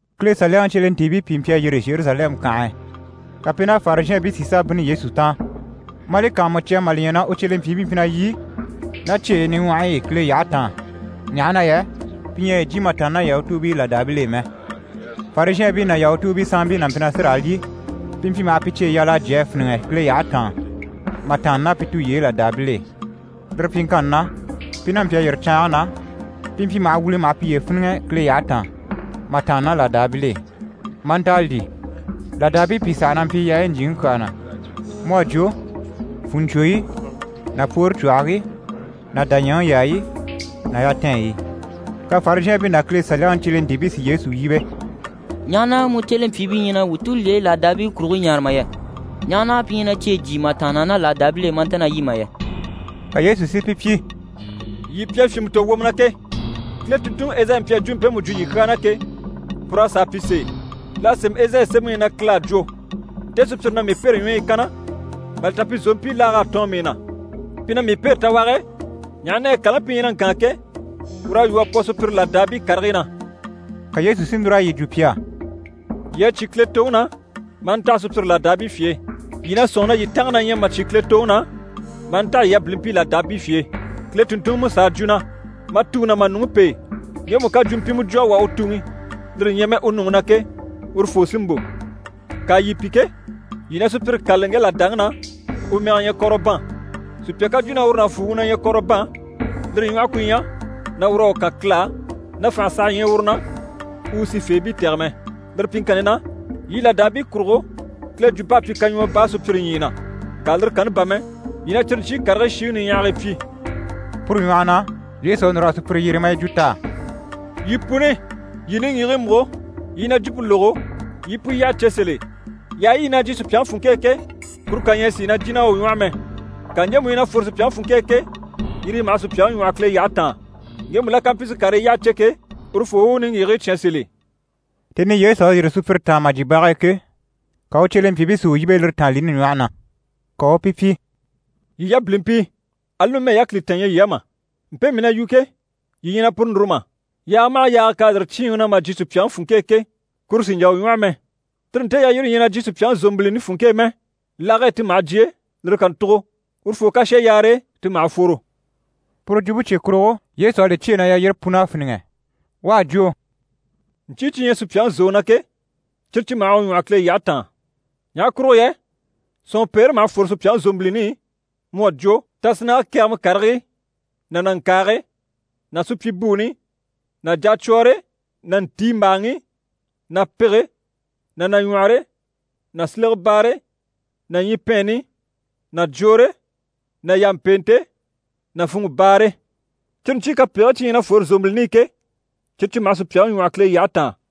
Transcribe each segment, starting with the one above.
Kile Saliyaŋi cyelentiibii pìi mpyi a yîri Zheruzalɛmu kànhe e, ka pi ná Farizhɛɛnbii si sà bínni Yesu taan. Maa li kàanmucya mà li ɲya na u cyelempyiibii mpyi na lyî ná cyeyi niɲwɔhɔyi i Kile yyahe taan, ɲaha na yɛ pi ɲyɛ a yi jyè mà tàanna ná Yahutuubii làdaabil'e mɛ. Farizhɛɛnbii ná Yahutuubii sanmpii n'a mpyi na sí raa lyî, pi mpyi maha cyeyi yal'a jyè a fíniŋɛ Kile yyahe taan mà tàanna ná pi tulyeyi làdaabil'e. Lire pyiŋkanni na, pi n'a mpyi a yîri caange na, pi mpyi maha wìli maha piye fíniŋɛ Kile yyahe taan mà tàanna ná làdaabil'e, maa nta a lyî. Làdaabii pìi saha na mpyi yaayi ɲjyìŋi kyaa na, mu à jwo: fùnɲcwoyi ná pwoore cwɔhigii ná dàɲyɛŋi yaayi ná yatɛɛnɲyi. Ka Farizhɛɛnbii ná Kile Saliyaŋi cyelentiibii si Yesu yíbe: «Ɲaha na mu cyelempyiibii ɲyɛ na wuu tulyeyi làdaabii kurigii ɲaare mà yɛ? Ɲaha na pi ɲyɛ na cyeyi jyíi mà tàanna ná làdaabil'e maa nta na lyî mà yɛ?» Ka Yesu si pi pyi: «Yii pi à fyìnmɛ tò wwomɔ na ke! Kile tùnntunŋi Ezayi mpyi a jwumpe mpemu jwo yii kyaa na ke, pur'à sàa pyi sèe. L'à sémɛ Ezayi sémɛŋi i na Kile à jwo: “Nte sùpyire na mii pêre ɲwɔyi i kanna, mà li ta pi zòompii laag'à tɔɔn mii na. Pi na mii pêre tawage e, ɲaha na yɛ kàlaŋi pi ɲyɛ na ŋkaan ke, ur'à lwɔ́ a pwɔ sùpyire làdaabii karigii na.”» Ka Yesu si núr'a yi jwo pi á: «Yii à cyé Kile toŋi na, maa ntaha sùpyire làdaabii fye e. Yii na sɔ̂nŋi na yii tànga na ɲyɛ mà cyé Kile toŋi na, maa ntaha yii yabilimpii làdaabii fye e. Kile tùnntunŋi Musa à jwo na “Ma tuŋi ná ma nuŋi pêe, ŋgemu ká jwumpimɛ jwo a wà u tuŋi, lire ɲyɛ mɛ u nuŋi na ke, urufoo sí n‑bò.” Ŋka yii pi ke, yii na sùpyire kâlali ŋge làdaŋi na, u mɛge ɲyɛ Kɔrɔban. Sùpya ká jwo na uru nàfuuŋi na ɲyɛ Kɔrɔban, lire ɲwɔhe ku ɲyɛ na ur'à u kan Kile á, na fànhe saha ɲyɛ uru na u u sifeebii tɛ̀gɛ mɛ. Lire pyiŋkanni na, yii làdaabii kurugo, Kile jwump'à pyi kaɲwɔɔ baa sùpyire ɲyii na, ŋka lire kanni bà mɛ, yii na cyire ɲcyii karigii shiŋi niɲyahagii pyi.» Puru ɲwɔhɔ na, Yesu à núr'a sùpyire yyere, maa yi jwo t'á: «Yii puni, yii niŋgyigigii múgo, yii i na jwumpe lógo, yii i pu yyaha cè sèl'e. Yaayi yi na jyìi sùpyaŋi funŋke e ke, kuru kà ɲyɛ a sìi na jìn'a u ɲwɔ́hɔ mɛ. Ŋka ɲjemu yi na fwore sùpyaŋi funŋke e ke, yire yi maha sùpyaŋi ɲwɔ́hɔ Kile yyahe taan. [ Ŋgemu la ká mpyi si karii yyaha cè ke, urufoo u u niŋgyigigii cyán sèl'e.]» Tèni i Yesu à yîri sùpyire taan mà jyè bage e ke, ka u cyelempyiibii si u yíbe lire tàanlini ɲwɔhe na. Ka u u pi pyi: «Yii yabilimpii, ali numɛ yákilitan ɲyɛ yii á mà? Mpe mii na yu ke, yii ɲyɛ na puru núru mà? Yaaga maha yaaga k'à yîri cyíinŋi na mà jyè sùpyaŋi funŋke e ke, kuru sì n‑jà u ɲwɔ́hɔ mɛ. Tire nte yalyire ɲyɛ na jyè sùpyaŋi zòmbilini funŋke e mɛ, lage e ti maha jyè, lire kàntugo, urufoo ká shà yaare e, ti maha fworo.» Pure jwumpe cye kurugo, Yesu à li cyêe na yalyire pun'à fíniŋɛ. U a jwo: «Ɲcyii cyi ɲyɛ sùpyaŋi zòŋi na ke, cyire cyi maha u ɲwɔ́hɔ Kile yyahe taan. Ɲaha kurugo yɛ sɔ̀nŋɔpeere maha fwore sùpyaŋi zòmbilini i, mu à jwo tasinnage kɛgɛmɛ karigii ná nàŋkaage ná supyibuuni ná jacwɔɔre ná ntiimbaaŋi ná pege ná nàɲwɔhɔre ná silegebaare ná ɲyipɛɛnni ná jwoore ná yàmpeente ná funŋɔbaare. Cyire ɲcyii kapegigii cyi ɲyɛ na fwore zòmbilini i ke, cyire cyi maha sùpyaŋi ɲwɔ́hɔ Kile yyahe taan.»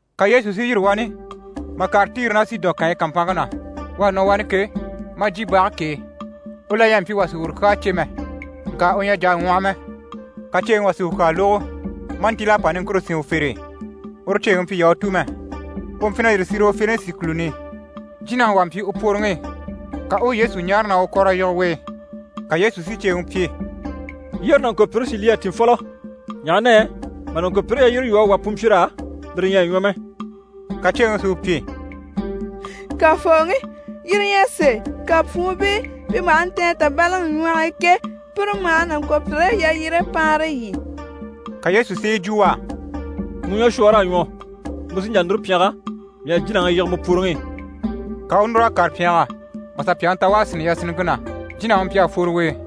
Ka Yesu si yîri wani mà kàre Tiri ná Sidɔn kànyi kàmpanŋke na. U à nɔ wani ke, maa jyè bage k'e. U la ɲyɛ a mpyi wà sì uru kyaa cè mɛ. Ŋka u ɲyɛ a jà a ŋwɔhɔ mɛ. Ka ceeŋi wà si u kyaa lógo, maa ntíl'a pa niŋkure sín u fere e. Uru ceeŋi mpyi Yahutu mɛ, u mpyi na yîri Sirofenisi kùluni i. Jínaŋi wà mpyi u pworoŋi i, ka u u Yesu ɲáare na u u kɔ̀r'a yige u e. Ka Yesu si ceeŋi pyi: «Yyére nàŋkopyire si lyî a tìn fɔlɔ, ɲaha na yɛ mà nàŋkopyire yalyire lwɔ́ a wà pwunmpyir'á, lire ɲyɛ a ɲwɔ mɛ.» Ka ceeŋi si u pyi: «Kafooŋi, yire ɲyɛ sèe, ŋka pwuunbii pi maha ntɛ̀n tàbalaŋi ɲwɔh'i ke, pire maha nàŋkopyire yalyire paanre lyî.» Ka Yesu si yi jwo u á: «Mu ɲwɔshwɔɔr'à ɲwɔ, mu sí n‑jà núru pyɛngɛ, mii à jínaŋi yige mu pworoŋi i.» Ka u u núr'a kàre pyɛngɛ mà sà pyàŋi ta u à sínni yasinniŋke na, jínaŋi mpyi a fworo u e.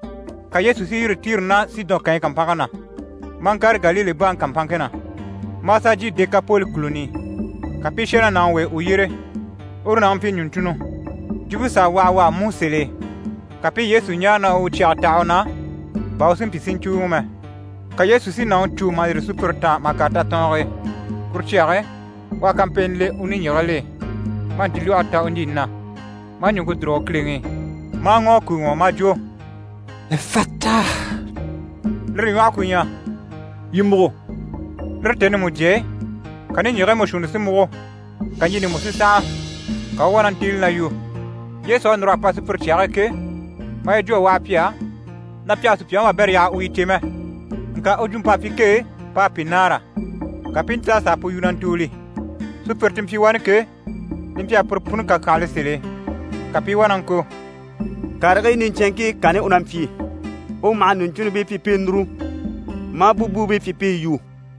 Ka Yesu si yîri Tiri ná Sidɔn kànyi kàmpanŋke na, maa ŋkàre Galile baŋi kàmpanŋke na, maa sà jyè Dekapoli kùluni i. Ka pi i shà ná nàŋi w'e u yyére. Uru nàŋi mpyi ɲùɲcunnɔ, jwumpe s'à waha u á mú sèl'e. Ka pi i Yesu ɲáare na u u cyɛge taha u na, bà u si mpyi si ɲcùuŋɔ mɛ. Ka Yesu si nàŋi cû mà yîri sùpyire taan mà kàre tatɔɔnge e. Kuru cyage e, u à kampeeni le u niŋgyigigil'e, maa ntilwɔhe ta u ɲjini na. Maa ɲùŋke dùrugo kileŋi i, maa ŋɔ̀ a kùuŋɔ, maa jwo: «Efata» lire ɲwɔhe ku ɲyɛ: «Yii múgo!» Lire tèni mujye e, ka niŋgyigigii mú shuunni si múgo, ka ɲjini mú si sànha. Ka u u wá na ntíili na yu. Yesu à núr'a pa sùpyire cyage e ke, maa yi jwo a waha pi á, na pi àha sùpyaŋi wabɛrɛ yaha u yi cè mɛ. Ŋka u jwump'à pyi kee p'à pi nâara, ka pi i ntíl'a sà a pu yu na ntùuli. Sùpyire ti mpyi wani ke, li mpyi a pire puni kàkyanhala sèl'e, ka pi i wá na ŋko: «Karigii niɲcɛnŋkii kanni u na mpyi. U maha ɲùɲcunnibii pyi pi i núru, maa búbuubii pyi pi i yu!»